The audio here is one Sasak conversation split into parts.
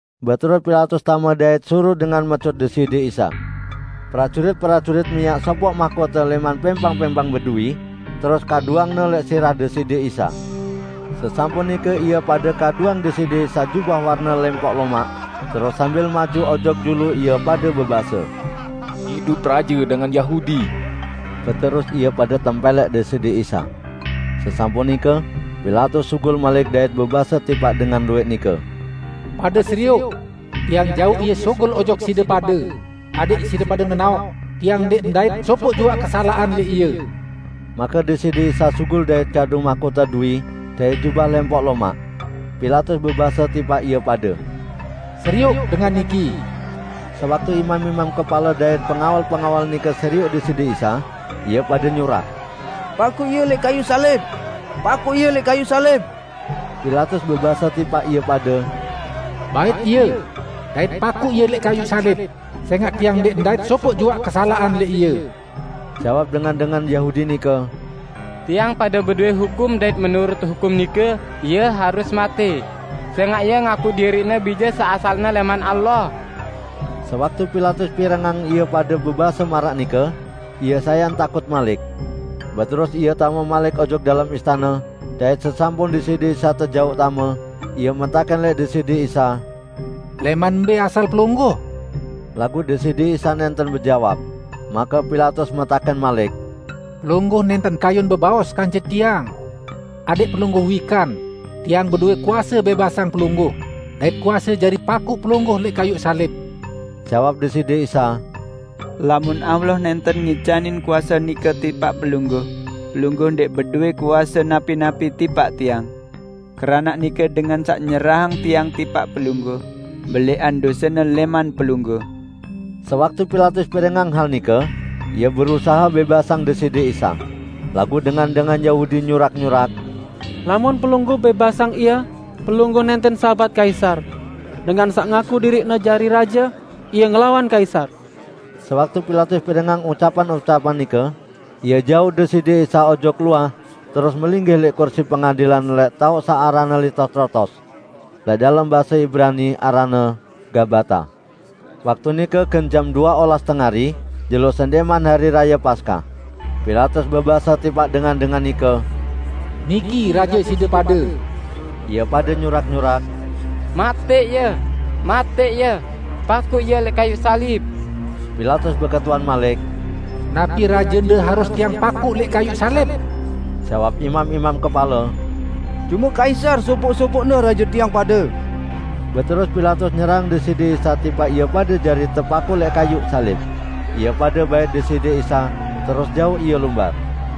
Beterus Pilatus tame dait suruq dengan mecut Deside Isa. Prajurit-prajurit miaq sopoq mahkote lẽman pẽmpang-pẽmpang beduwi, terus kaduangne lẽq sirah Deside Isa. Sesampun nike ie pade kaduang Deside Isa jubah warne lempok lomaq, terus sambil maju ojok julu ie pade bebase, "Idup raje dengan Yahudi!" Beterus ie pade tempẽlẽk Deside Isa. Sesampun nike Pilatus sugul malik dait bebase tipaq dengan luwẽq nike, "Pade serioq! Tiang jauq Ie sugul ojok side pade, adẽq side pade nenaoq tiang ndẽq ndait sopoq juaq kesalaqan lẽq Ie." Make Deside Isa sugul dait kadu mahkote duwi dait jubah lempok lomaq. Pilatus bebase tipaq ie pade, "Serioq dengan niki." Sewaktu imam-imam kepale dait pengawal-pengawal nike serioq Deside Isa, ie pade nyurak, "Pakuq Ie lẽq kayuq salib! Pakuq Ie lẽq kayuq salib!" Pilatus bebase tipaq ie pade, "Bait Ie, dait pakuq Ie lẽq kayuq salib, sẽngaq tiang ndẽq ndait sopoq juaq kesalaqan lẽq Ie." Jawab dengan-dengan Yahudi nike, "Tiang pade bedowẽ hukum dait menurut hukum nike Ie harus matẽ, sẽngaq Ie ngaku diriq-Ne Bije saq asalne lẽman Allah." Sewaktu Pilatus pirengang ie pade bebase maraq nike, ie sayan takut malik. Beterus ie tame malik ojok dalem istane, dait sesampun Deside Isa tejauq tame, ie metakẽn lẽq Deside Isa, "Lẽman mbẽ asal Pelungguh?" Laguq Deside Isa nẽnten bejawab. Make Pilatus metakẽn malik, "Pelungguh nẽnten kayun bebaos kance tiang? Adẽq Pelungguh wikan, tiang bedowẽ kuase bẽbasang Pelungguh, dait kuase jari pakuq Pelungguh lẽq kayuq salib!" Jawab Deside Isa, "Lamun Allah nẽnten ngicanin kuase nike tipaq pelungguh, pelungguh ndẽq bedowẽ kuase napi-napi tipaq Tiang. Keranaq nike dengan saq nyerahang Tiang tipaq pelungguh, belẽqan dosene lẽman pelungguh." Sewaktu Pilatus pirengang hal nike, ie berusahe bẽbasang Deside Isa. Laguq dengan-dengan Yahudi nyurak-nyurak, "Lamun pelungguh bẽbasang Ie, pelungguh nẽnten sahabat Kaisar, dengan saq ngaku diriqne jari raje, ie ngelawan Kaisar!" Sewaktu Pilatus pirengang ucapan-ucapan nike, ie jauq Deside Isa ojok luah terus melinggih lẽq kursi pengadilan lẽq taoq saq aranne Litostrotos. (Lẽq dalem base Ibrani aranne Gabata.) Waktu nike gen jam due olas tengari, jelo sendẽqman Hari Raye Paskah. Pilatus bebase tipaq dengan-dengan nike, "Niki raje side pade!" Ie pade nyurak-nyurak, "Matẽq Ie! Matẽq Ie! Pakuq Ie lẽq kayuq salib!" Pilatus beketuan malik, "Napi rajende harus tiang pakuq lẽq kayuq salib?" Jawab imam-imam kepale, "Cume Kaisar sopoq-sopoqne raje tiang pade!" Beterus Pilatus nyerahang Deside Isa tipaq ie pade jari tepakuq lẽq kayuq salib. Ie pade bait Deside Isa, terus jauq Ie lumbar.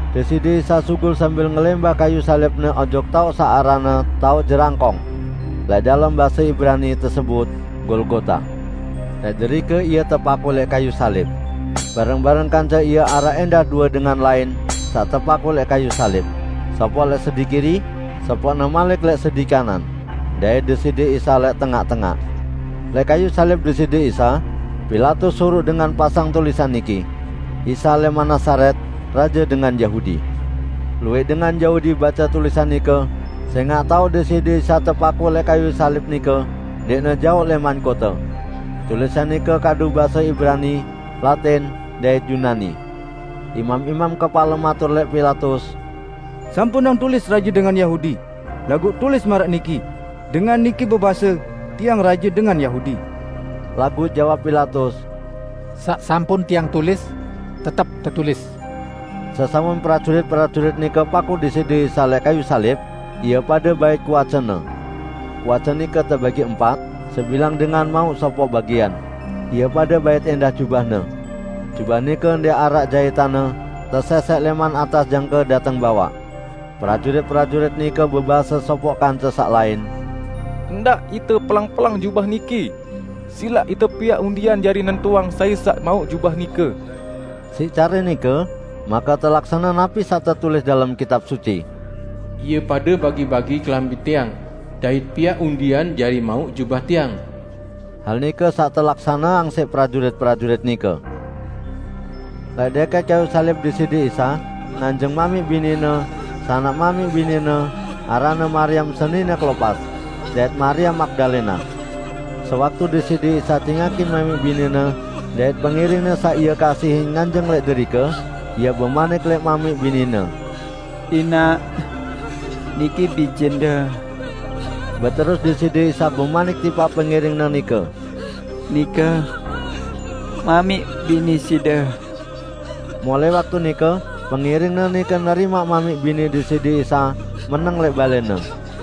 Deside Isa sugul sambil ngelẽmbah kayuq salib-Ne ojok taoq saq aranne "Taoq Jerangkong". (Lẽq dalem base Ibrani tesebut, Golgota.) Lẽq derike Ie tepakuq lẽq kayuq salib. Bareng-bareng kance Ie araq ẽndah due dengan lain saq tepakuq lẽq kayuq salib; sopoq lẽq sedi kiri, sopoqne malik lẽq sedi kanan, dait Deside Isa lẽq tengaq-tengaq. Lẽq kayuq salib Deside Isa, Pilatus suruq dengan pasang tulisan niki: "Isa lẽman Nazaret, Raje Dengan Yahudi". Luwẽq dengan Yahudi bace tulisan nike, sẽngaq taoq Deside Isa tepakuq lẽq kayuq salib nike ndẽqne jaoq lẽman kote. Tulisan nike kadu base Ibrani, Latin, dait Yunani. Imam-imam kepale matur lẽq Pilatus, "Sampunang tulis 'Raje dengan Yahudi', laguq tulis maraq niki, 'Dengan niki bebase, Tiang Raje dengan Yahudi.' " Laguq jawab Pilatus, "Saq sampun tiang tulis, tetep tetulis." Sesampun prajurit-prajurit nike pakuq Deside Isa lẽq kayuq salib, ie pade bait kuace-Ne. Kuace nike tebagi empat: Sebilang dengan mauq sopoq bagian. Ie pade bait ẽndah jubah-Ne. Jubah nike ndẽq araq jaitanne -- tesẽsẽk lẽman atas jangke dateng bawaq. Prajurit-prajurit nike bebase sopoq kance saq lain, "Ndaq ite peleng-peleng jubah niki. Silaq ite piaq undian jari nentuang sai saq mauq jubah nike." Siq care nike make telaksane napi saq tetulis dalem Kitab Suci: "Ie pade bagi-bagi kelambi Tiang, dait piaq undian jari mauq jubah Tiang." Hal nike saq telaksaneang siq prajurit-prajurit nike. Lẽq dẽkẽt kayuq salib Deside Isa, nganjeng mamiq bini-Ne, sanak mamiq bini-Ne, aranne Mariam senine Klopas, dait Mariam Magdalena. Sewaktu Deside Isa cingakin mamiq bini-Ne dait pengiring-Ne saq Ie kasihin nganjeng lẽq derike, Ie bemanik lẽq mamiq bini-Ne, "Inaq, niki bijende." Beterus Deside Isa bemanik tipaq pengiring-Ne nike, "Nike mamiq bini side." Mulai waktu nike pengiring-Ne nike nerimaq mamiq bini Deside Isa meneng lẽq balẽne.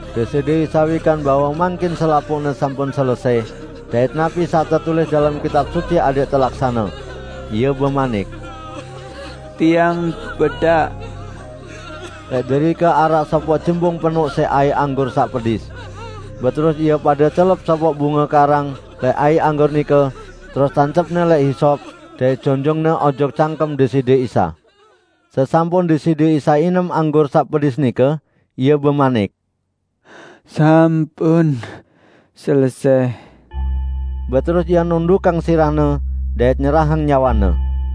Deside Isa wikan bahwe mangkin selapuqne sampun selesẽ, dait napi saq tetulis dalem Kitab Suci adẽq telaksane. Ie bemanik, "Tiang bedak." Lẽq derike araq sopoq jembung penoq siq aiq anggur saq pedis. Beterus ie pade celep sopoq bunge karang lẽq aiq anggur nike, terus tancepne lẽq hisop dait jonjongne ojok cangkem Deside Isa. Sesampun Deside Isa inem anggur saq pedis nike, Ie bemanik, "Sampun selesẽ!" Beterus Ie nundukang sirah-Ne dait nyerahang nyawe-Ne.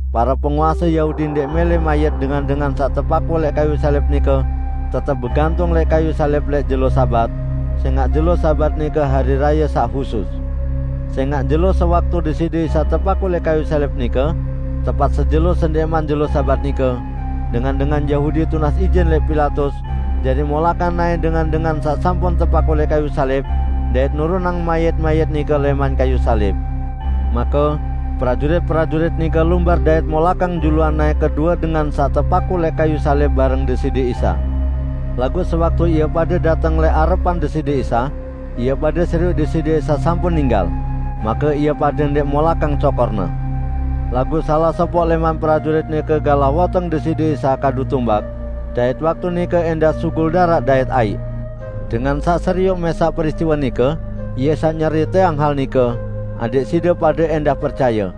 Pare penguase Yahudi ndẽq mẽlẽ mayit dengan-dengan saq tepakuq lẽq kayuq salib nike tetep begantung lẽq kayuq salib lẽq jelo Sabat, sẽngaq jelo Sabat nike Hari Raye saq husus. Sẽngaq jelo sewaktu Deside Isa tepakuq lẽq kayuq salib nike tepat sejelo sendẽqman jelo Sabat nike, dengan-dengan Yahudi tunas ijin lẽq Pilatus jari molakang naẽ dengan-dengan saq sampun tepakuq lẽq kayuq salib dait nurunang mayit-mayit nike lẽman kayuq salib. Make, prajurit-prajurit nike lumbar dait molakang juluan naẽ kedue dengan saq tepakuq lẽq kayuq salib bareng Deside Isa. Laguq sewaktu ie pade dateng lẽq arepan Deside Isa, ie pade serioq Deside Isa sampun ninggal. Make ie pade ndẽq molakang cokor-Ne. Laguq salaq sopoq lẽman prajurit nike galah woteng Deside Isa kadu tumbak; dait waktu nike ẽndah sugul daraq dait aiq. Dengan saq serioq mẽsaq peristiwe nike, ie saq nyeriteang hal nike, adẽq side pade ẽndah percaye.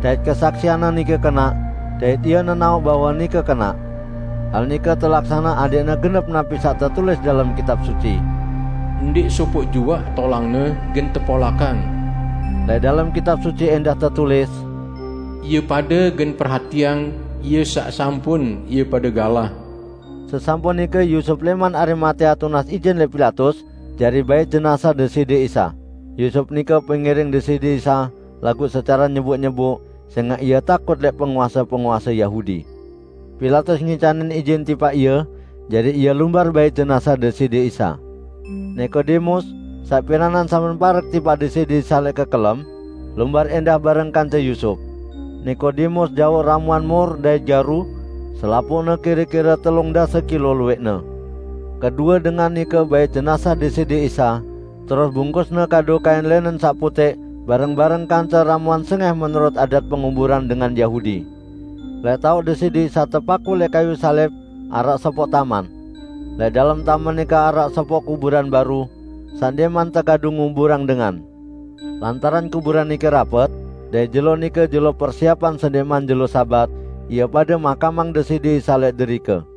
Dait kesaksianne nike kenaq, dait ie nenaoq bahwe nike kenaq. Hal nike telaksane adẽqne genep napi saq tetulis dalem Kitab Suci, "Ndẽq sopoq juaq tolang-Ne gen tepolakang." Lẽq dalem Kitab Suci ẽndah tetulis: "Ie pade gen perhatiang Ie saq sampun ie pade galah." Sesampun nike Yusup lẽman Arimatea tunas ijin lẽq Pilatus jari bait jenazah Deside Isa. (Yusup nike pengiring Deside Isa laguq secare nyeboq-nyeboq, sẽngaq ie takut lẽq penguase-penguase Yahudi.) Pilatus ngicanin ijin tipaq ie, jari ie lumbar bait jenazah Deside Isa. Nikodemus, saq piranan sampun parek tipaq Deside Isa lẽq kekelem, lumbar ẽndah bareng kance Yusup. Nikodemus jauq ramuan mur dait garu -- selapuqne kire-kire telung dase kilo luwẽqne. Kedue dengan nike bait jenazah Deside Isa, terus bungkusne kadu kain lẽnen saq putẽq bareng-bareng kance ramuan sengẽh menurut adat penguburan dengan Yahudi. Lẽq taoq Deside Isa tepakuq lẽq kayuq salib araq sopoq taman. Lẽq dalem taman nike araq sopoq kuburan baru, saq ndẽqman tekadu nguburang dengan. Lantaran kuburan nike rapet, dait jelo nike jelo persiepan sendẽqman jelo Sabat, ie pade makamang Deside Isa lẽq derike.